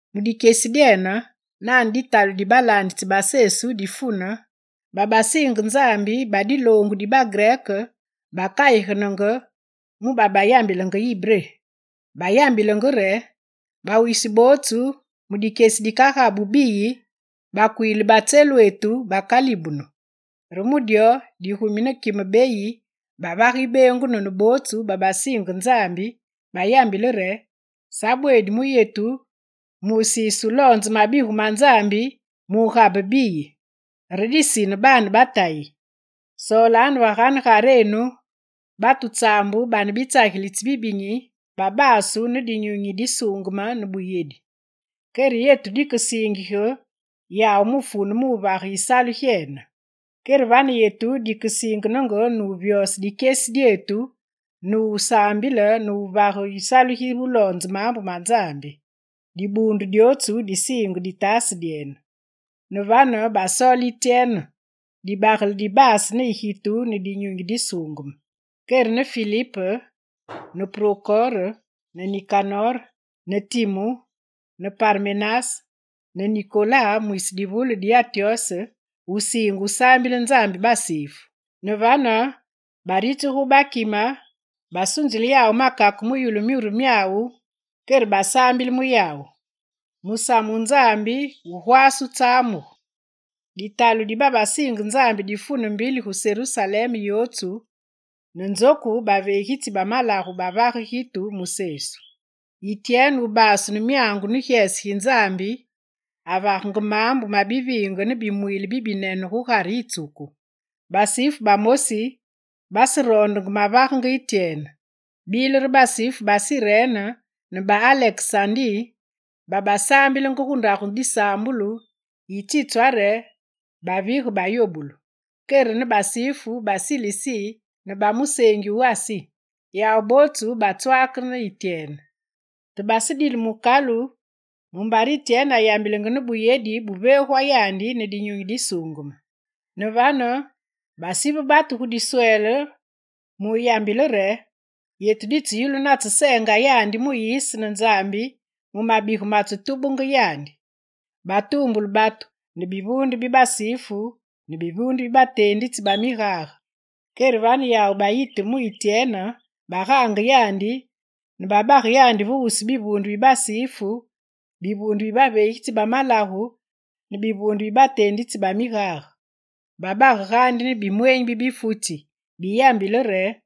Mu dikyesi dyene, nane ditalu di balaanditsi ba Sesu difune, babasiinge Nzambi ba diloongu di bagrek bakayigenenge mu babayambilenge ibré Diloongu diyambulungu wisi wootsu gu tseengi yi Israel.. Bayambilenge re: «Bawisi bootsu mu dikyesi dikagabu biyi, bakwiili ba tselwetu bakalibunu.» Re mu dyo digumi ne kime beyi bavage yibeengunu ne bootsu babasiinge Nzambi, bayambile re: «Sa bweedi mu yetu, musiise wuloonze mabigu ma Nzambi mugabe biyi. Re disine, baane ba Tayi, soolanu ve ganegarenu batu tsaambu bane bitsagilitsi bibinyi, ba babasu ne Dinyunyi Disuungeme ne buyedi, kere yetu dikesiingige yawu mufune wuvage yisalu gyene. Kere vane yetu dikesiingenenge nuvyose dikyesi dyetu ne wusaambile ne wuvage yisalu gi wuloonze maambu ma Nzambi.» Dibuundu dyootsu disiinge ditaase dyene. Ne vane, basoole Ityene, dibagele dibaase ne gitu ne Dinyunyi Disuungeme, kere ne Filip ne Prokore ne Nikanor ne Timu ne Parmenas ne Nikolas mwisi divule di Antyose, wusiinge wusaambile Nzambi basifu. Ne vane baritsigu gu bakime, basunzile yawu makake mu yulu myuru myawu, kere basaambile mu yawu. Musamu wu Nzambi wugwaase wutsamugu. Ditalu di babasiinge Nzambi difune mbili gu Serusalem yootsu, ne nzoku baveegitsi ba malagu bavage gitu mu Sesu. Ityene wubaasu ne myangu ne gyese gi Nzambi avagenge maambu ma biviinge ne bimwiile bibinene gugare yitsuku. Basifu bamosi baseroondenge mavagenge Ityene. Bile re basifu ba Sirene ne ba Alekesandi babasaambilenge gu ndagu disaambulu yitsitwa re, Bavige bayobulu, kere ne basifu ba Silisi ne ba museengi wu Asi. Yawu bootsu batswake ne Ityene. Te basedile mukalu mumbare Ityene ayambilenge ne buyedi buveegwa yandi ne Dinyunyi Disuungeme. Ne vane, basive batu gu diswele muyambile re: «Yetu ditseyulu natseseenga yandi Muyise ne Nzambi mu mabigu matsetubenge yandi.» Batuumbule batu ne bivuunde bi basifu ne bivuunde bi bateenditsi ba migage. Kere vane yawu bayiteme mu Ityene, bagaange yandi ne babage yandi ve wusu bivuunde bi basifu, bivuunde bi baveegitsi ba malagu ne bivuunde bi bateenditsi ba migage. Babage gaandi ne bimweenyi bi bifutsi biyambile re: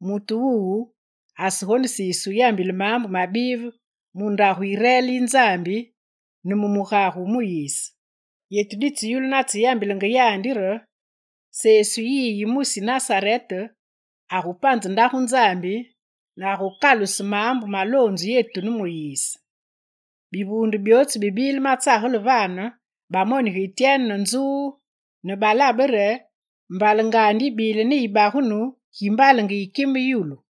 «Mutu wuwu asegonesiise wuyambile maambu mabive mu ndagu yi reel yi Nzambyetu ne mu mugage wu Muyise. Yetu ditseyulu natseyambilenge yandi re Sesu yiyi yi mwisi Nasarete agupanze Ndagu Nzambi ne agukaluse maambu maloonzu yetu ne Muyise.» Bivuunde byootsu bibile matsagele vane, bamonige Ityene ne nzuu ne balabe re mbalengandi yibile ne yibagunu gi mbalenge yi kime yulu.